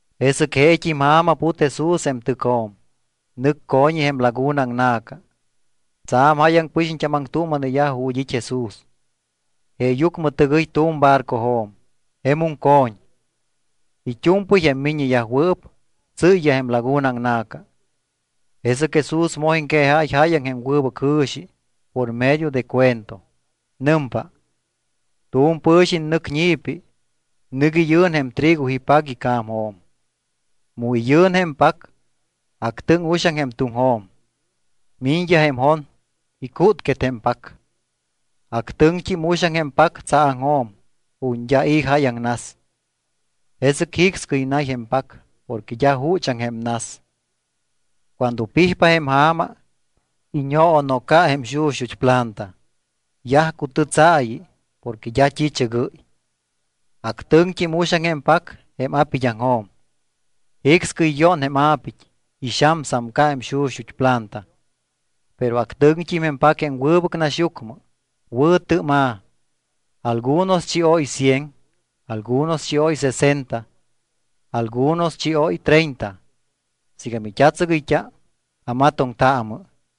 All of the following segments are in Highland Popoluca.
Jesɨc jeet́im ja̱ma put Jesús jém tɨcjo̱m. Nɨc co̱ñi je̱m laguna aŋna̱ca. Tsa̱m jáyaŋ pɨxiñt́am aŋtuuma̱neyaj ju̱t́ it́ Jesús. Jeeyucmɨ tɨgɨy tu̱m barcojo̱m, jemum co̱ñ. It́u̱mpɨy jém miññeyajwɨɨp tsɨ́yyaj jém laguna aŋna̱ca. Jesɨc Jesús moj iŋquejáy jáyaŋ jém wɨbɨc jɨ̱xi por medio de cuento. Nɨmpa: —Tu̱m pɨ̱xiñ nɨc ñi̱pi. Nɨc iyɨ̱n jém trigo ipac ica̱mjo̱m. Mu iyɨ̱n jém pac, actɨŋ uxaŋ jém tuŋjo̱m. Miñyaj jém jon, icútquet jém pac. Actɨŋt́im uxaŋ jém pac tsaaŋjo̱m ju̱t́ d́a i̱ jáyaŋ nas. Jesɨc jicscɨy nay jém pac porque d́a juchaŋ jém nas. Cuando pijpa jém ja̱ma, iñoonoca jém xuxut́ planta. Yaj cutɨ́tsaayiyaj porque d́a t́i̱chɨgɨ́y. Actɨŋt́im uxaŋ jém pac jém a̱pid́aŋjo̱m. Jicscɨy yón jém a̱pit́, ixamsamca jém xuxut́ planta. Pero actɨŋt́im jém pac jém wɨbɨc naxyucmɨ. Wɨ̱tɨ́ma̱. Algunos chióy cien, algunos chióy sesenta, algunos chióy treinta. Siiga mit́a̱tsɨgɨyt́a, amatoŋtaamɨ.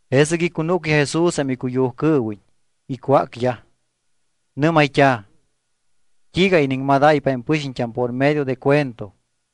Jesɨc icunúcyaj Jesús jém icuyujcɨɨwiñ, icwácyaj. Nɨ́mayt́a̱: —¿T́iiga iniŋmadáypa jém pɨxiñt́am por medio de cuento?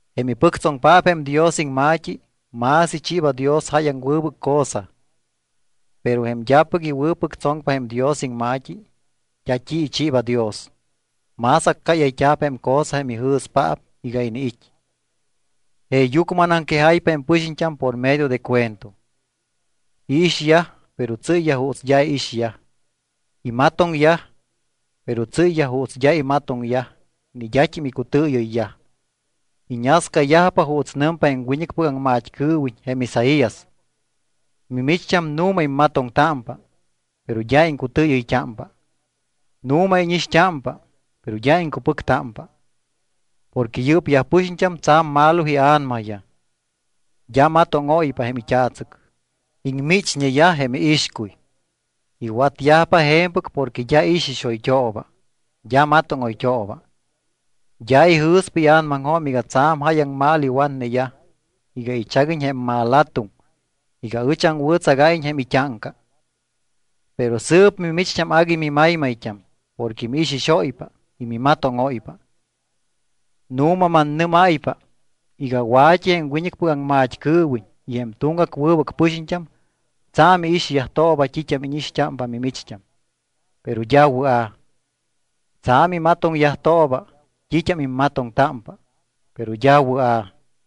Jém ipɨctsoŋpaap jém Dios iŋma̱t́i, más ichiiba Dios jáyaŋ wɨbɨc cosa. Pero jém d́apɨc iwɨ̱pɨctsoŋpa jém Dios iŋma̱t́i, d́a t́i ichiiba Dios, más accáyayt́a̱p jém cosa jém ijɨ̱spaap iga iniit́. Jeeyucmɨ anaŋquejáypa jém pɨxiñt́am por medio de cuento. Iixyaj, pero tsɨ́yyaj juuts d́a iixyaj. Imatoŋyaj, pero tsɨ́yyaj juuts d́a imatoŋyaj ni d́at́im icutɨɨyɨyyaj. Iñascayajpa juuts nɨmpa jém wiñɨcpɨc aŋmat́cɨɨwiñ jém Isaías: Mimicht́am nu̱ma immatoŋtámpa, pero d́a iŋcutɨɨyɨyt́ámpa. Nu̱ma íñixt́ámpa, pero d́a iŋcupɨctámpa. Porque yɨ́pyaj pɨxiñt́am tsa̱m malo ia̱namayaj, d́a matóŋóypa jém it́a̱tsɨc, iŋmichñeyaj jém iixcuy. Iwatyajpa je̱mpɨc porque d́a ixixoyt́ooba, d́a matóŋoyt́ooba, d́a ijɨ̱spa ia̱namaŋjo̱m iga tsa̱m jáyaŋ mal iwatneyaj iga ichaguiñ jém malatuŋ iga ɨch aŋwɨ̱tsagáyiñ jém it́áŋca. ’Pero sɨɨp mimicht́am agui mimaymayt́am porque miixixóypa y mimatóŋóypa. Nu̱ma mannɨ́máypa iga wa̱t́i jém wiñɨcpɨc aŋmat́cɨɨwiñ y jém tuŋgac wɨbɨc pɨxiñt́am tsa̱m iixyajtooba t́it́am íñixt́ámpa mimicht́am, pero d́a wɨa̱. Tsa̱m imatoŋyajtooba t́it́am immatoŋtámpa, pero d́a wɨa̱.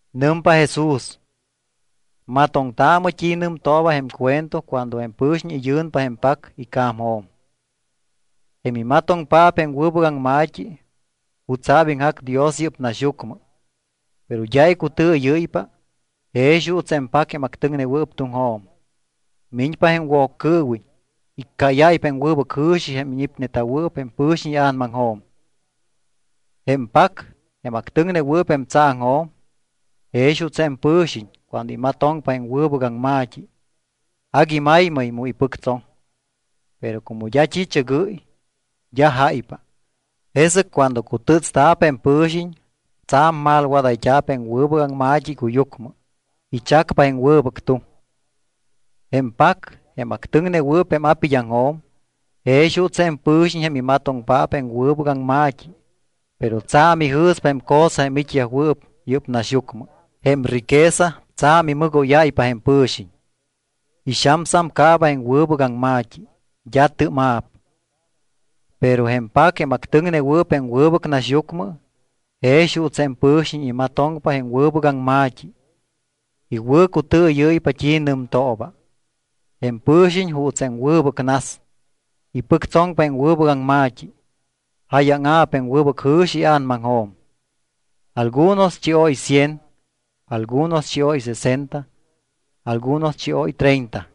Nɨmpa Jesús: —Matoŋtaamɨ t́i nɨmtooba jém cuento cuando jém pɨ̱xiñ iyɨ̱npa jém pac ica̱mjo̱m. Jém imatoŋpaap jém wɨbɨc aŋma̱t́i jutsa̱p iŋjac Dios yɨ́p naxyucmɨ, pero d́a icutɨɨyɨ́ypa, jex juuts jém pac jém actɨŋnewɨɨp tuŋjo̱m. Miñpa jém Woccɨɨwiñ, iccáyáypa jém wɨbɨc jɨ̱xi jém ñipneta̱wɨɨp jém pɨ̱xiñ ia̱namaŋjo̱m. Jém pac, jém actɨŋnewɨɨp jém tsaaŋjo̱m, jex juuts jém pɨ̱xiñ cuando imatoŋpa jém wɨbɨc aŋma̱t́i, agui maymay mu ipɨctsoŋ. Pero como d́a t́i̱chɨgɨ́y, d́a jáypa. Jesɨc cuando cutɨ́tsta̱p jém pɨ̱xiñ, tsa̱m malwadayt́a̱p jém wɨbɨc aŋma̱t́i icuyucmɨ, ichacpa jém wɨbɨc tuŋ. Jém pac, jém actɨŋnewɨɨp jém a̱pid́aŋjo̱m, jex juuts jém pɨ̱xiñ jém imatoŋpaap jém wɨbɨc aŋma̱t́i, pero tsa̱m ijɨ̱spa jém cosa jém it́yajwɨɨp yɨ́p naxyucmɨ. Jém riqueza tsa̱m imɨgóyáypa jém pɨ̱xiñ. Ixamcaaba jém wɨbɨc aŋma̱t́i. D́a tɨ́ma̱p. Pero jém pac, jém actɨŋnewɨɨp jém wɨbɨc naxyucmɨ, jex juuts jém pɨ̱xiñ imatoŋpa jém wɨbɨc aŋma̱t́i, iwɨ̱cutɨɨyɨ́ypa t́i nɨmtooba. Jém pɨ̱xiñ juuts jém wɨbɨc nas. Ipɨctsoŋpa jém wɨbɨc aŋma̱t́i, jáyaŋa̱p jém wɨbɨc jɨ̱xi ia̱namaŋjo̱m. Algunos chióy cien, algunos chióy sesenta, algunos chióy treinta.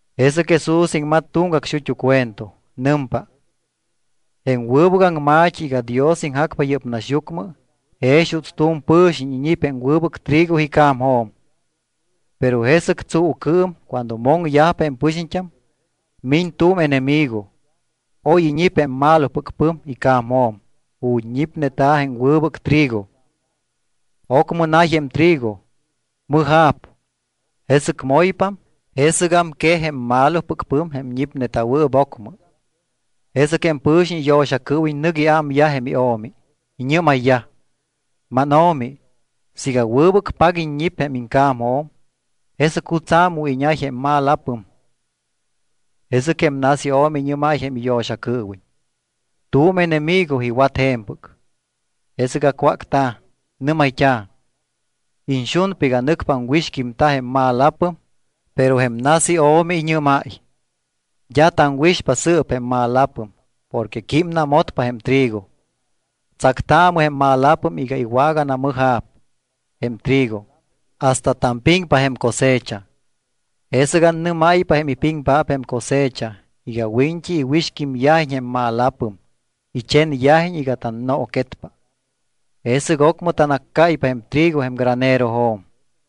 Jesɨc Jesús iŋmat tuŋgac xut́u cuento. Nɨmpa: —Jém wɨbɨc aŋma̱t́i iga Dios iŋjacpa yɨ́p naxyucmɨ jex juuts tu̱m pɨ̱xiñ iñip jém wɨbɨc trigo ica̱mjo̱m. Pero jesɨc tsuucɨɨm cuando moŋyajpa jém pɨxiñt́am miñ tu̱m enemigo. Oy iñip jém malopɨc pɨm ica̱mjo̱m ju̱t́ ñipneta̱ jém wɨbɨc trigo. Ocmɨ nay jém trigo, mɨja̱p, jesɨc moypam. Jesɨgam quej jém malopɨc pɨm jém ñipneta̱wɨɨp ocmɨ. Jesɨc jém pɨ̱xiñ iyo̱xacɨɨwiñ nɨc iámyaj jém io̱mi. Iñɨ́mayyaj: “Máno̱mi, siiga wɨbɨc pac iññip jém iŋca̱mjo̱m, ¿jesɨc jutsa̱ mu iñay jém malapɨm?” Jesɨc jém nas io̱mi iñɨ́máy jém iyo̱xacɨɨwiñ: “Tu̱m enemigo iwat je̱mpɨc.” Jesɨc acwácta̱, nɨ́mayt́a̱: “¿Iñxunpa iga nɨcpa aŋwixquímta jém malapɨm?” Pero jém nas io̱mi iñɨ́máy: “D́a taŋwixpa sɨɨp jém malapɨm porque químnamotpa jém trigo. Tsactaamɨ jém malapɨm iga iwaganamɨja̱p jém trigo hasta tampiŋpa jém cosecha. Jesɨc annɨ́máypa jém ipiŋpaap jém cosecha iga wiñt́i iwixquímyajiñ jém malapɨm, ichenyajiñ iga tannooquetpa. Jesɨc ocmɨ tanaccáypa jém trigo jém granerojo̱m.”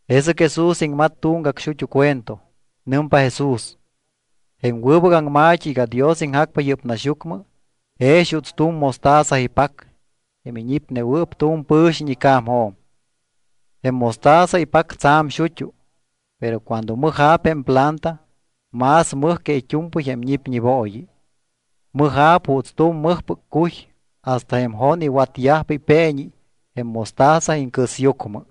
Jesɨc Jesús iŋmat tuŋgac xut́u cuento. Nɨmpa Jesús: —Jém wɨbɨc aŋma̱t́i iga Dios iŋjacpa yɨ́p naxyucmɨ jex juuts tu̱m mostaza ipac jém iñipnewɨɨp tu̱m pɨ̱xiñ ica̱mjo̱m. Jém mostaza ipac tsa̱m xut́u, pero cuando mɨja̱p jém planta más mɨj que it́u̱mpɨy jém ñipñibooyi. Mɨja̱p juuts tu̱m mɨjpɨc cuy hasta jém jon iwatyajpa ipeeñi jém mostaza iŋcɨsyucmɨ.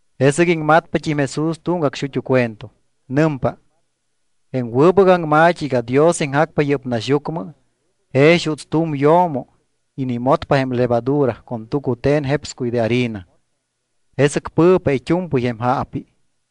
Jesɨc iŋmatpat́im Jesús tuŋgac xut́u cuento. Nɨmpa: —Jém wɨbɨc aŋma̱t́i iga Dios iŋjacpa yɨ́p naxyucmɨ jex juuts tu̱m yo̱mo inimotpa jém levadura con tucute̱n jepscuy de harina. Jesɨc pɨ̱pa it́u̱mpɨy jém jaapi.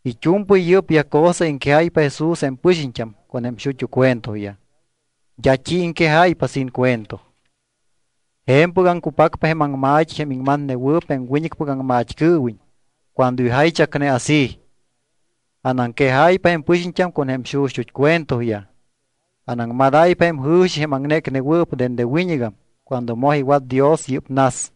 It́u̱mpɨy yɨ́pyaj cosa iŋquejáypa Jesús jém pɨxiñt́am con jém xuxut́ cuentoyaj. D́a t́i iŋquejáypa sin cuento. Je̱mpɨgam cupacpa jém aŋma̱t́i jém iŋmatnewɨɨp jém wiñɨcpɨc aŋmat́cɨɨwiñ cuando ijaychacne así: Anaŋquejáypa jém pɨxiñt́am con jém xuxut́ cuentoyaj. Anaŋmadáypa jém jɨ̱xi jém aŋnécnewɨɨp dende wiñɨgam cuando moj iwat Dios yɨ́p nas.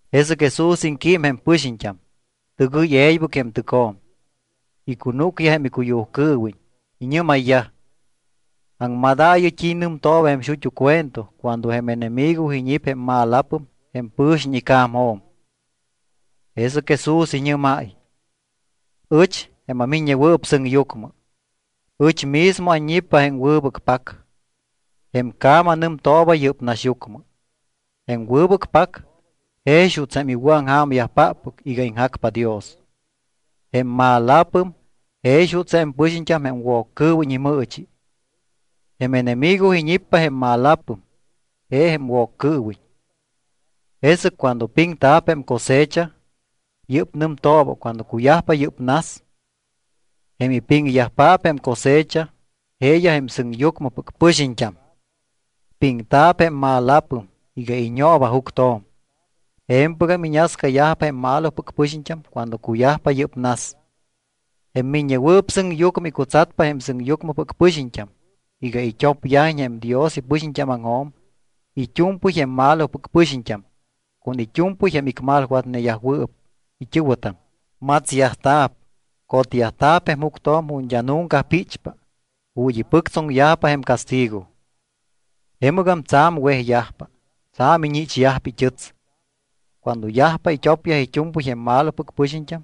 Jesɨc Jesús iŋquím jém pɨxiñt́am. Tɨgɨy e̱ybɨc jém tɨcjo̱m. Icunúcyaj jém icuyujcɨɨwiñ. Iñɨ́mayyaj: —Aŋmadaayɨ t́i nɨmtooba jém xut́u cuento cuando jém enemigo iñip jém malapɨm jém pɨ̱xiñ ica̱mjo̱m. Jesɨc Jesús iñɨ́máy: —Ɨch, jém aMiññewɨɨp Sɨŋyucmɨ, ɨch mismo anñippa jém wɨbɨc pac. Jém ca̱ma nɨmtooba yɨ́p naxyucmɨ. Jém wɨbɨc pac jex juuts jém iwɨ̱aŋja̱myajpáppɨc iga iŋjacpa Dios. Jém malapɨm jex juuts jém pɨxiñt́am jém Woccɨɨwiñ imɨɨchi. Jém enemigo iñippa jém malapɨm, je jém Woccɨɨwiñ. Jesɨc cuando piŋta̱p jém cosecha, yɨ́p nɨmtooba cuando cuyajpa yɨ́p nas. Jém ipiŋyajpaap jém cosecha jeeyaj jém sɨŋyucmɨpɨc pɨxiñt́am. Piŋta̱p jém malapɨm iga iñooba juctjo̱m, je̱mpɨgam iñascayajpa jém malopɨc pɨxiñt́am cuando cuyajpa yɨ́p nas. Jém Miññewɨɨp Sɨŋyucmɨ icutsatpa jém sɨŋyucmɨpɨc pɨxiñt́am iga it́opyajiñ jém Dios ipɨxiñt́ámaŋjo̱m it́u̱mpɨy jém malopɨc pɨxiñt́am con it́u̱mpɨy jém icmalwatneyajwɨɨp it́ɨ̱wɨtam. Matsyajta̱p, cotyajta̱p jém juctjo̱m ju̱t́ d́a nunca píchpa, ju̱t́ ipɨctsoŋyajpa jém castigo. Jemɨgam tsa̱m wejyajpa, tsa̱m iñichyajpa it́ɨts. Cuando yajpa it́opyaj it́u̱mpɨy jém malopɨc pɨxiñt́am,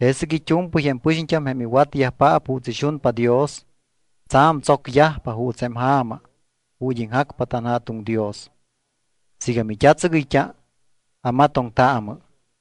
jesɨc it́u̱mpɨy jém pɨxiñt́am jém iwatyajpaap juuts ixunpa Dios, tsa̱m tsocyajpa juuts jém ja̱ma ju̱t́ iŋjacpa tanJa̱tuŋ Dios. Siiga mit́atsɨgɨyt́a, amatoŋtaamɨ.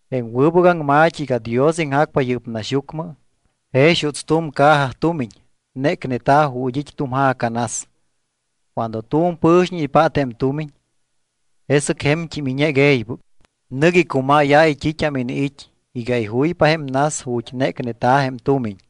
’Jém wɨbɨc aŋma̱t́i iga Dios iŋjacpa yɨ́p naxyucmɨ jex juuts tu̱m caja tumiñ nécneta̱ ju̱t́ it́ tu̱m ja̱ca nas. Cuando tu̱m pɨ̱xiñ ipát jém tumiñ, jesɨc je̱mt́im iñec e̱ybɨc. Nɨc icumáyáy t́it́am iniit́ iga ijuypa jém nas ju̱t́ nécneta̱ jém tumiñ.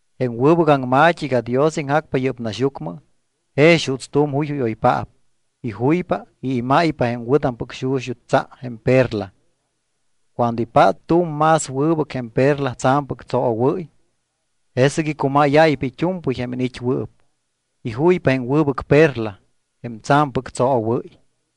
’Jém wɨbɨc aŋma̱t́i iga Dios iŋjacpa yɨ́p naxyucmɨ jex juuts tu̱m juyjúyoypaap. Ijuypa y imáypa jém wɨ̱tampɨc xuxut́ tsa jém perla. Cuando ipát tu̱m más wɨbɨc jém perla tsa̱mpɨc tsoowɨ́y, jesɨc icumáyáypa it́u̱mpɨy jém iniit́wɨɨp. Ijuypa jém wɨbɨc perla jém tsa̱mpɨc tsoowɨ́y.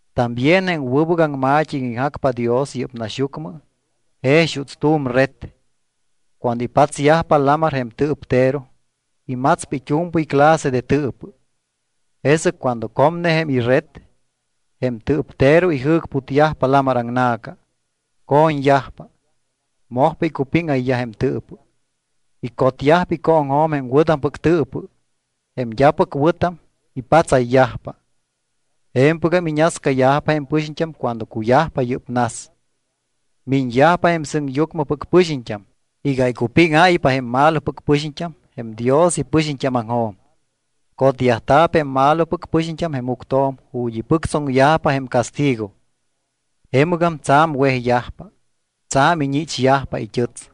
’También jém wɨbɨc aŋma̱t́i iga iŋjacpa Dios yɨ́p naxyucmɨ jex juuts tu̱m red, cuando ipatsyajpa lamar jém tɨɨptero, imatspa it́u̱mpɨy clase de tɨɨpɨ. Jesɨc cuando comne jém ired, jém tɨɨptero ijɨ̱cputyajpa lamar aŋna̱ca. Co̱ñyajpa, mojpa icupíŋayyaj jém tɨɨpɨ. Icotyajpa icooŋjo̱m jém wɨ̱tampɨc tɨɨpɨ. Jém d́apɨc wɨ̱tam ipatsayyajpa. Je̱mpɨgam iñascayajpa jém pɨxiñt́am cuando cuyajpa yɨ́p nas. Miñyajpa jém sɨŋyucmɨpɨc pɨxiñt́am iga icupíŋáypa jém malopɨc pɨxiñt́am jém Dios ipɨxiñt́ámaŋjo̱m. Cotyajta̱p jém malopɨc pɨxiñt́am jém juctjo̱m ju̱t́ ipɨctsoŋyajpa jém castigo. Jemɨgam tsa̱m wejyajpa, tsa̱m iñichyajpa it́ɨts.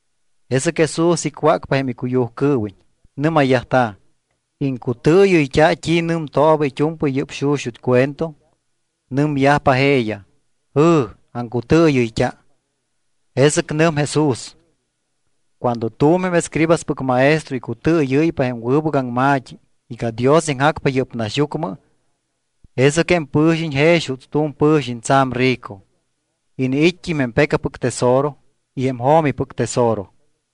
Jesɨc Jesús icwácpa jém icuyujcɨɨwiñ. Nɨ́mayyajta̱: —¿Iŋcutɨɨyɨyt́a t́i nɨmtooba it́u̱mpɨy yɨ́p xuxut́ cuento? Nɨmyajpa jeeyaj: —Jɨ̱, aŋcutɨɨyɨyt́a. Jesɨc nɨm Jesús: —Cuando tu̱m jém escribaspɨc maestro icutɨɨyɨ́ypa jém wɨbɨc aŋma̱t́i iga Dios iŋjacpa yɨ́p naxyucmɨ, jesɨc jém pɨ̱xiñ jex juuts tu̱m pɨ̱xiñ tsa̱m rico. Iniit́t́im jém pecapɨc tesoro y jém jo̱mipɨc tesoro.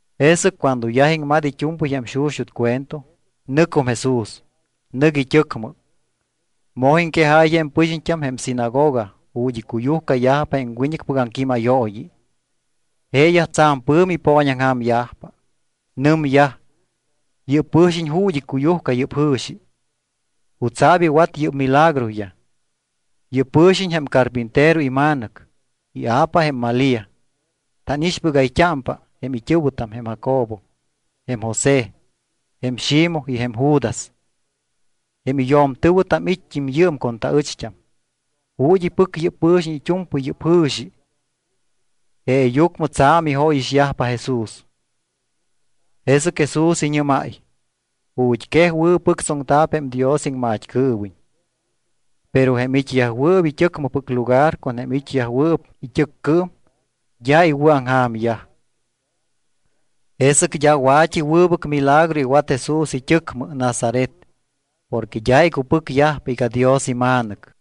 Jesɨc cuando yaj iŋmat it́u̱mpɨy jém xuxut́ cuento, nɨcum Jesús. Nɨc it́ɨcmɨ. Moj iŋquejáy jém pɨxiñt́am jém sinagoga ju̱t́ icuyujcayajpa jém wiñɨcpɨc aŋquímayooyi. Jeeyaj tsa̱m pɨ̱mi ipooñaŋja̱myajpa. Nɨmyaj: —¿Yɨ́p pɨ̱xiñ ju̱t́ icuyujca yɨ́p jɨ̱xi? ¿Jutsa̱p iwat yɨ́p milagroyaj? Yɨ́p pɨ̱xiñ jém carpintero ima̱nɨc. Ia̱pa jém Malía. Tánixpɨgayt́ámpa jém it́ɨ̱wɨtam jém Jacobo, jém José, jém Ximoj y jém Judas. Jém iyo̱mtɨ̱wɨtam it́t́im yɨɨm con taɨcht́am. ¿Ju̱t́ ipɨc yɨ́p pɨ̱xiñ it́u̱mpɨy yɨ́p jɨ̱xi? Jeeyucmɨ tsa̱m ijóyixyajpa Jesús. Jesɨc Jesús iñɨ́máy: —Ju̱t́quej wɨ̱pɨctsoŋta̱p jém Dios iŋmat́cɨɨwiñ. Pero jém it́yajwɨɨp it́ɨcmɨpɨc lugar con jém it́yajwɨɨp it́ɨccɨɨm d́a iwɨ̱aŋja̱myaj. Jesɨc d́a wa̱t́i wɨbɨc milagro iwat Jesús it́ɨcmɨ, Nazaret, porque d́a icupɨcyajpa iga Dios iMa̱nɨc.